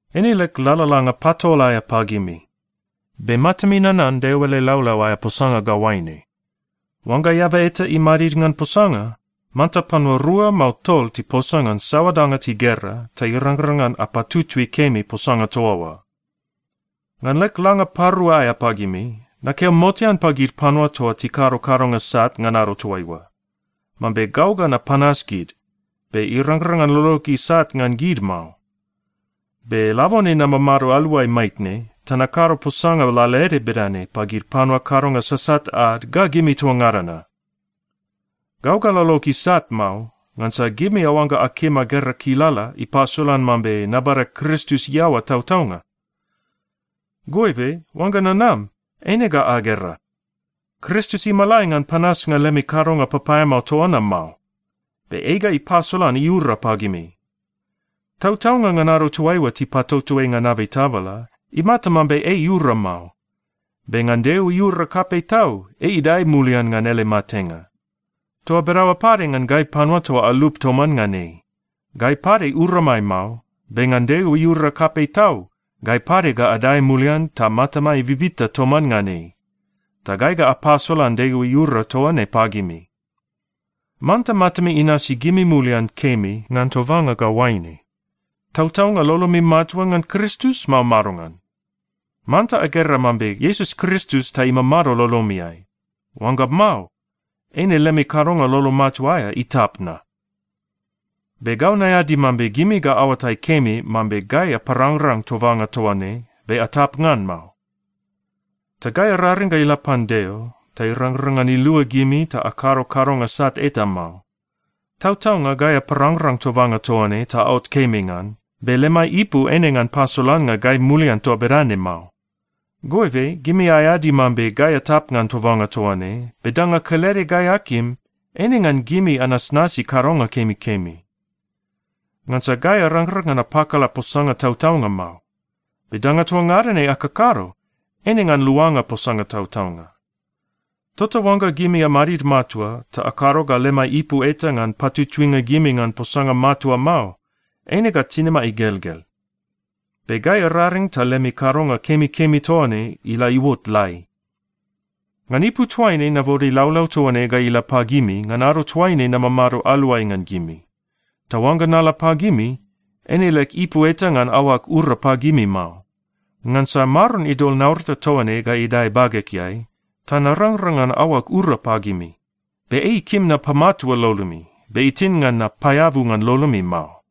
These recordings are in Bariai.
Eine leg lalalanga patol aea pagimi. Be matami nanan Deo ele laulau aea posanga ga oaine, “Oangga eaba eta imadid ngan posanga, manta panua rua mao tol tiposa ngan saoa danga tigera, ta irangrang ngan apatutui kemi posanga toa oa.” Ngan leg langa parua aea pagimi, nakeo motean pagid panua toa tikado kadonga sat ngan ado toaiua, mambe gau ga napanas gid, be irangrang ngan lolog isat ngan gid mao. Be labone namamado aluai maitne ta nakado posanga lalaede bedane pagid panua kadonga sasat ad ga gimi toa ngada na. Gau ga lolog isat mao, ngansa gimi aoangga akim agera kilala ipasolan mambe nabada Kristus iaoa tautaunga. Goibe oangga nanam, eine ga agera. Kristus imalai ngan panasnga lemi kadonga papaeamao toa na mao. Be ei ga ipasolan iura pagimi. Tautaunga ngan ado toaiua tipatoto ei ngan abei tabala, imata mambe ei iura mao. Be ngan Deo iura kapei tau, ei idae mulian ngan ele matenga. Toa bedaoa pade ngan gai panua toa alup toman ngan ei. Gai pade uramai mao, be ngan Deo iura kapei tau, gai pade ga adae mulian ta matamai bibita toman ngan ei. Ta gai ga apasolan Deo iura toa ne pagimi. Manta matami inasi gimi mulian kemi ngan tobanga ga oaine: Tautaunga lolomi matua ngan Kristus, mao madongan? Manta agera mambe Iesus Kristus ta imamado lolomiai. Oangga mao, eine lemi kadonga lolo matua aea itap na. Be gau naeadi mambe gimi ga aoatai kemi mambe gai aparangrang tobanga toa ne, be atap ngan mao. Ta gai araring ga ila pan Deo ta irangrang ngan ilua gimi ta akado kadonga sat eta mao. Tautaunga gai aparangrang tobanga toa ne ta aot kemi ngan, be lemai ipu eine ngan pasolannga gai mulian toa bedane mao. Goibe gimi aeadi mambe gai atap ngan tobanga toa ne, be danga kelede gai akim, eine ngan gimi anasnasi kadonga kemikemi. Ngansa gai arangrang ngan apakala posanga tautaunga mao. Be danga toa ngada ne akakado, eine ngan luanga posanga tautaunga. Tota oangga gimi amadid matua ta akado ga lemai ipu eta ngan patutuinga gimi ngan posanga matua mao, eine ga tinimai igelgel. Be gai araring ta lemi kadonga kemikemi toa ne ila iuot lai. Ngan ipu toaine nabode laulau toa ne ga ila pagimi ngan ado toaine namamado aluai ngan gimi. Ta oangga nala pagimi, eine leg ipu eta ngan aoag ura pagimi mao. Ngansa Maron idol naurata toa ne ga idae bagegeai, ta narangrang ngan aoag ura pagimi. Be ei ikim napamatua lolomi, be itin ngan napaeabu ngan lolomi mao.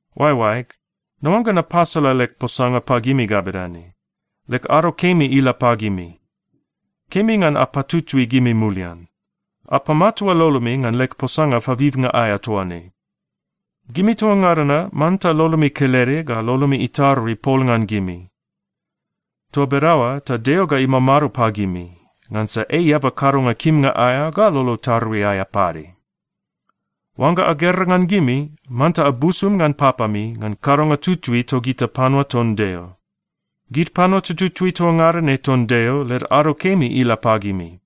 Oaeoaeg, naoangga napasala leg posanga pagimi ga bedane: Leg ado kemi ila pagimi. Kemi ngan apatutui gimi mulian. Apamatua lolomi ngan leg posanga pabibnga aea toa ne. Gimi toa ngada na manta lolomi kelede ga lolomi itarui pol ngan gimi. Toa bedaoa ta Deo ga imamado pagimi, ngansa ei eaba kadonga kimnga aea ga lolo tarui aea pade. Oangga agera ngan gimi, manta abusum ngan papami ngan kadonga tutui togita panua ton Deo. Gid panua tututui toa ngada ne ton Deo, led ado kemi ila pagimi.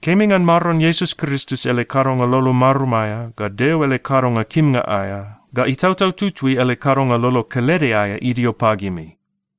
Kemi ngan Maron Iesus Kristus ele kadonga lolo marum aea, ga Deo ele kadonga kimnga aea, ga Itautau Tutui ele kadonga lolo kelede aea idio pagimi.